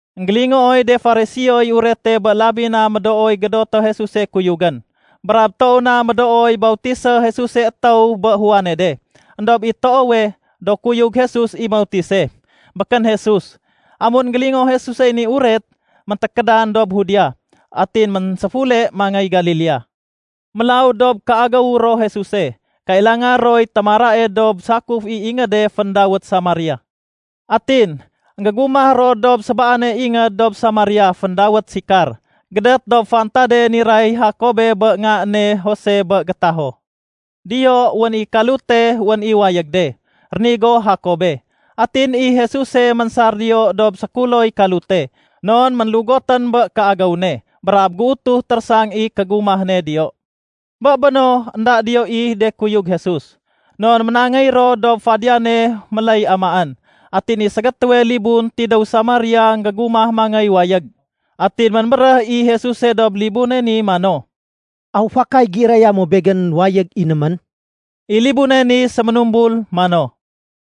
Enggélingooy de Fariseoy urete bé labi na médooy gédoté Jesuse kuyugén brab toow na médooy bautisé Jesuse étéw bé Juane de. Endob i toowe, do kuyug Jesus i mautise, békén Jesus. Amun énggélingoo Jesusey ni uret, méntékédan dob Judea, atin ménséfule mangéy Galilea. Mélaw dob kéagéw ro Jesuse, kailanga roy témarae dob sakuf i ingéde féndawét Samaria. Atin, énggégumah ro dob sébaane ingéd dob Samaria féndawét Sikar, gédét dob fantade niray Jakobé bé nga ne Jose bé gétaho. Diyo, wén i kalute wén i wayég de, rénigo Jakobe. Atin i Jesuse ménsar diyo dob sékuloy kalute. Non ménlugotén bé kéagéw ne brab géutuh térésang i kégumah ne diyo. Bé béno, énda diyo i de kuyug Jesus non ménangéy ro dob fadiyane méléy amaén. Atin i ségétéwe libun tidéw Samaria énggégumah mangéy wayég. Atin ménbéréh i Jesuse dob libune ni mano, “Aw fakay géiraya mo Begén wayég inémén?” I libune ni séménumbul mano,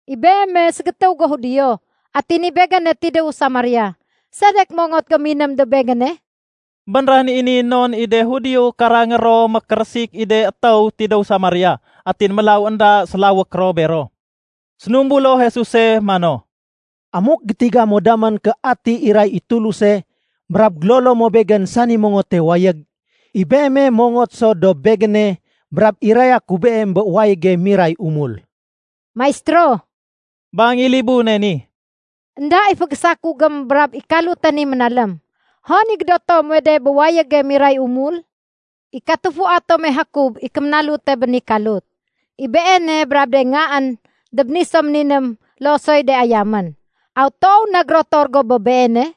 “I Beeme ségétéw go Judio atin i begéne tidéwu Samaria. Sedek mongot go miném dob begéne?” (Bénréhén i ni non i de Judio karangé ro mékérésik i de étéw tidéw Samaria, atin mélaw énda sélawék ro bero.) Sénumbulo Jesuse mano, “Amuk gétiga mo damén ké ati iray i Tuluse brab gélolo mo Begén sani mongote wayég, i beeme mongot so dob Begéne brab iraya ku beem bé wayége miray umul.” “Maistéro,” bang i libune ni, “énda i fégésakugém brab i kalute ni ménalém. Hon i gédoto muwe de bé wayége miray umul? I katufua tome Jakob i kéménalute bé ni kalut. I beene brab de ngaén dob ni so méniném loo soy de ayamén. Aw toow na gérotor go bé beene?”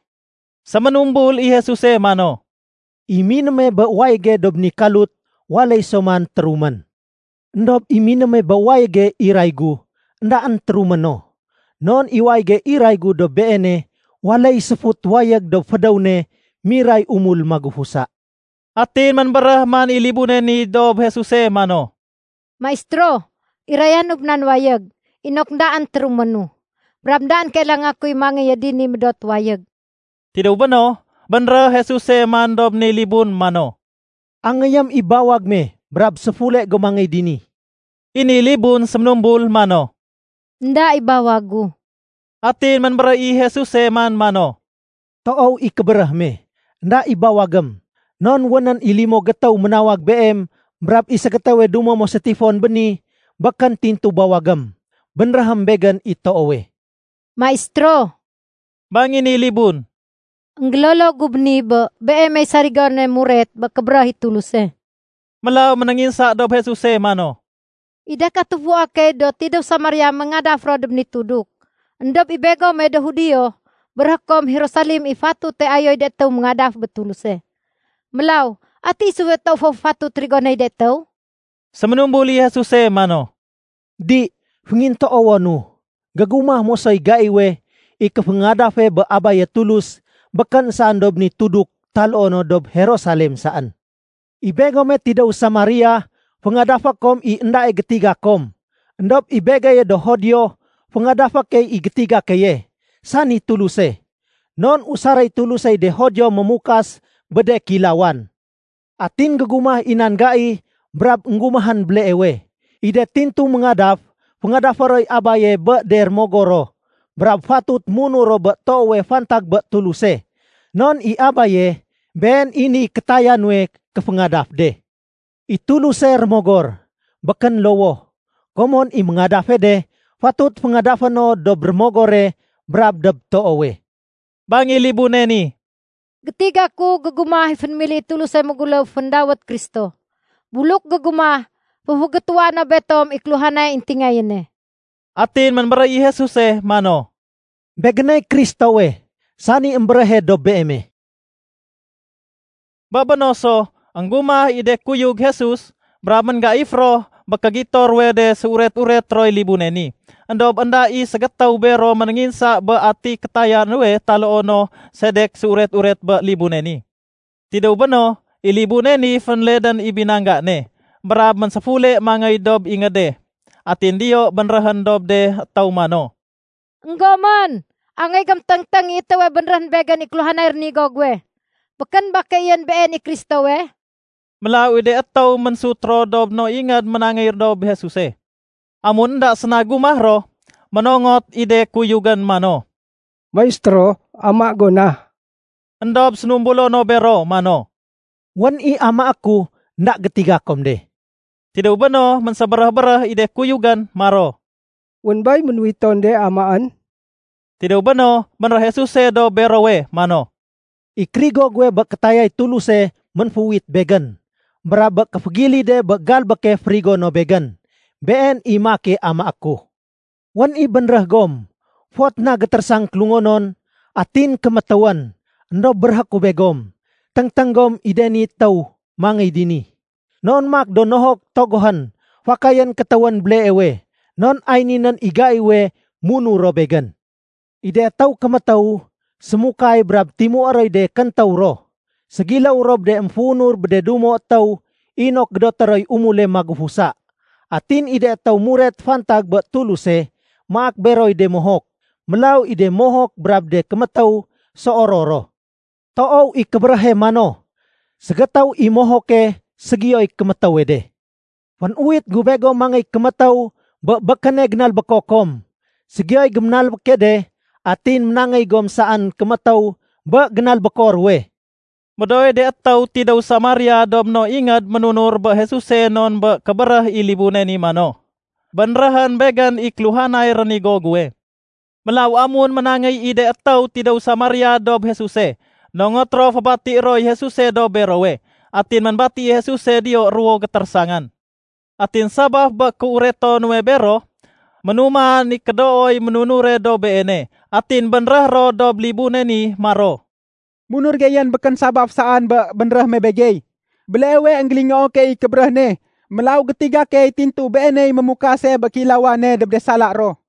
Séménumbul i Jesuse mano, “I minéme bé wayége dob ni kalut waléy so man térumén. Endob i minéme bé wayége iray gu, éndaén térumé no. Non i wayége iray gu dob beene waléy séfut wayég dob fédéw ne miray umul magufusa.” Atin ménbéréh man i libune ni dob Jesuse mano, “Maistéro, irayanu bé nan wayég, inok éndaén téruménu, brab éndaén kailanga kuy mangéye dini médot wayég.” Tidéw béno, bénréh Jesuse man dob ni libun mano, “Angéyém i bawag me brab séfule go mangéy dini.” I ni libun séménumbul mano, “Enda i bawag gu.” Atin ménbéréh i Jesuse man mano, “Toow i kébéréh me, énda i bawagém. Non wénén i limo gétéw ménawag beem brab i ségétéwe dumo mo sétifon béni békén tintu bawagém. Bénréhém Begén i toowe.” “Maistéro,” bang i ni libun, “Enggélolo gu béni bé Beemey sarigone muret bé kébéréh i Tuluse.” Mélaw ménénginsa dob Jesuse mano, “I de katufua key do tidéw Samaria ménéngadaf ro dob ni tuduk, éndob i begome do Judio, béréhé kom, Jerusalem i fatute ayoy de étéw méngadaf bé Tuluse. Mélaw ati isuwe toow fatut rigonéy de étéw?” Séménumbul i Jesuse mano, “Di, féngintoowonu. Gégumah mosoy gaiwe, i kéféngadafe bé Abaye Tulus, békén saén dob ni tuduk taloo no dob Jerusalem saén. I begome tidéw Samaria, féngadafé kom i éndae gétiga kom, éndob i begeye do Judio féngadafé key i gétiga keye, sani Tuluse. Non usaréy Tulusey de Judio mémukas bé de kéilawan. Atin gégumah i nan gai brab énggumahén béleewe, i de tintu méngadaf, féngadafé roy Abaye bé de rémogor ro brab fatut munur ro bé toowe fantag bé Tuluse. Non i Abaye, been i niy kétaya nuwe kéféngadaf de. I Tuluse, Rémogor, békén lowoh. Komon i méngadafe de, fatut féngadafé no dob rémogore brab dob toowe.” Bang i libune ni, “Gétiga ku gégumah i fénémili i Tuluse méguléw féndawét Kristo. Buluk gégumah, féfégétuwa no betom i kéluhanay éntingayéne.” Atin ménbéréh i Jesuse mano, “Begéney Kristowe, sani émbéréhe dob beeme.” Bé béno so, énggumah i de kuyug Jesus, brab ménggaif ro bé kégito ruwe de séuret-uret roy libune ni. Endob énda i ségétéw bero ménénginsa bé ati kétaya nuwe taloo no sedek séuret-uret bé libune ni. Tidéw béno, i libune ni fénledén i binangga ne, brab ménséfule mangéy dob ingéde. Atin diyo bénréhén dob de étéw mano, “Enggomén, angéy gom téngténg i étéwe bénréhén begén i kéluhanay rénigo guwe. Békén ba keeyén Been i Kristowe?” Mélaw i de étéw ménsut ro dob no ingéd ménangéy dob Jesuse. Amun énda séna gumah ro, ménongot i de kuyugén mano, “Maistéro, ama go na.” Endob sénumbulo no bero mano, “Wén i amaé ku énda gétiga kom de.” Tidéw béno ménsébéréh-béréh i de kuyugén maro, “Wén bay ménuwiton de amaén?” Tidéw béno, bénréh Jesuse dob berowe mano, “I kérigo guwe bé kétayay Tuluse ménféuwit Begén, brab bé kéfégilide bé galbéke férigo no Begén, been i maake amaé ku. Wén i bénréh gom, ‘Fot na gétérésang kélungonon, atin kémétéwén.’ Endob béréhé ku begom, téngténg gom i de ni étéw mangéy dini, non maak do nohok togohén, fakayén kétéwén béleewe. Non ay ninén i gaiwe munur ro Begén. I de étéw kémétéw sémahud brab timué roy de kéntéw ro. Ségiléw ro bé de émféunur bé de dumo étéw inok gédoté roy umule magufusa. Atin i de étéw muret fantag bé Tuluse, maak beroy de mohok. Mélaw i de mohok brab de kémétéw séoror ro. Toow i kébéréhe mano, ‘Ségétéw i mohoke, ségiyoy kémétéwe de.’ Fénuwit gu begom mangéy kémétéw bé békéne génalbéko kom, ségiyoy géménalbéke de atin ménangéy gom saén kémétéw bé génalbéko ruwe.” Médooy de étéw tidéw Samaria dob no ingéd ménunur bé Jesuse non bé kébéréh i libune mano, “Bénréhén begén i kéluhanay rénigo guwe.” Mélaw amun ménangéy i de étéw tidéw Samaria dob Jesuse, nongot ro fébatié roy Jesuse dob berowe. Atin ménbati i Jesuse diyo ruwo gétérésangan. Atin sabaf bé kéureto nuwe bero, ménuman i kédooy ménunure dob Beene. Atin bénréh ro dob libune ni maro, “Munur geyén békén sabaf saén bé bénréh me begey. Béleewe énggélingoo key i kébéréh ne, mélaw gétiga key tintu Beeney mémukase bé kéilawane dob de sala ro.”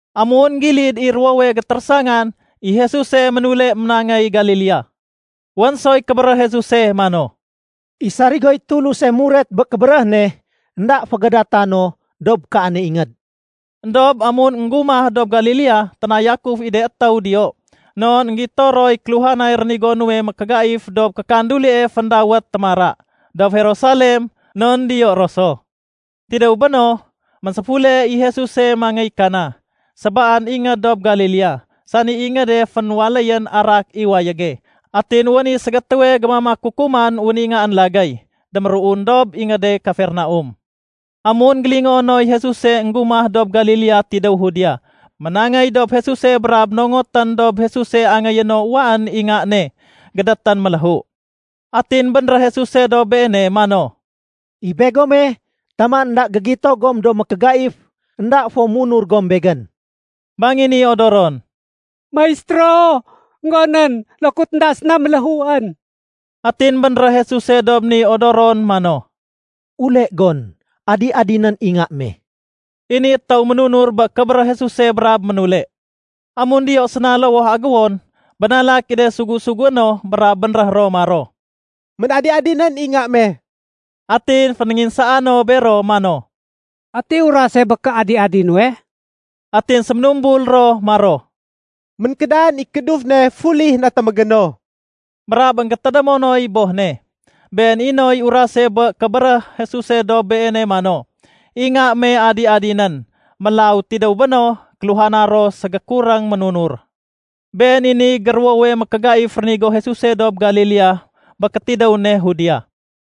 Amun énggilid i ruwowe gétérésangan, i Jesuse ménule ménangéy Galilea. Wén soy kébéréh Jesuse mano, “I sarigoy Tuluse muret bé kébéréh ne, énda fégadata no dob kaane ingéd.” Endob amun énggumah dob Galilea, ténayakuf i de étéw diyo, non énggito roy kéluhanay rénigo nuwe mékégaif dob kékandulie féndawét “Témara” dob Jerusalem, non diyo ro so. Tidéw béno, ménséfule i Jesuse mangéy Kana, sébaan ingéd dob Galilea, sani ingéde fénwaléyén arak i wayége. Atin wén i ségétéwe gémamak kukuman wén i ngaén lagéy déméruun dob ingéde Kafernaum. Amun énggélingoo noy Jesuse énggumah dob Galilea tidéw Judea, ménangéy dob Jesuse brab nongotén dob Jesuse angéyé no uwaén i nga ne gédétén méléhu. Atin bénréh Jesuse dob beene mano, “I begome, taman énda gégito gom do mékégaif, énda fo munur gom Begén.” Bang i ni odoron, “Maistéro, énggonén, lokut énda séna méléhuén.” Atin bénréh Jesuse dob ni odoron mano, “Ule gon, adi-adinén i nga me.” I ni étéw ménunur bé kébéréh Jesuse brab ménule. Amun diyo séna lowoh agéwon, bénalak i de sugu-sugué no brab bénréh ro maro, “Ménadi-adinén i nga me.” Atin fénénginsaa no bero mano, “Ati urase bé kéadi-adi nuwe?” Atin séménumbul ro maro, “Ménkédan i kééduf ne fuli natémégéno.” Brab énggétédémoy boh ne been i noy urase bé kébéréh Jesuse dob beene mano, “I nga me adi-adinén.” Mélaw tidéw béno, kéluhana ro ségékuréng ménunur. Been i niy géruwowe mékégaif rénigo Jesuse dob Galilea bé kétidéw ne Judea.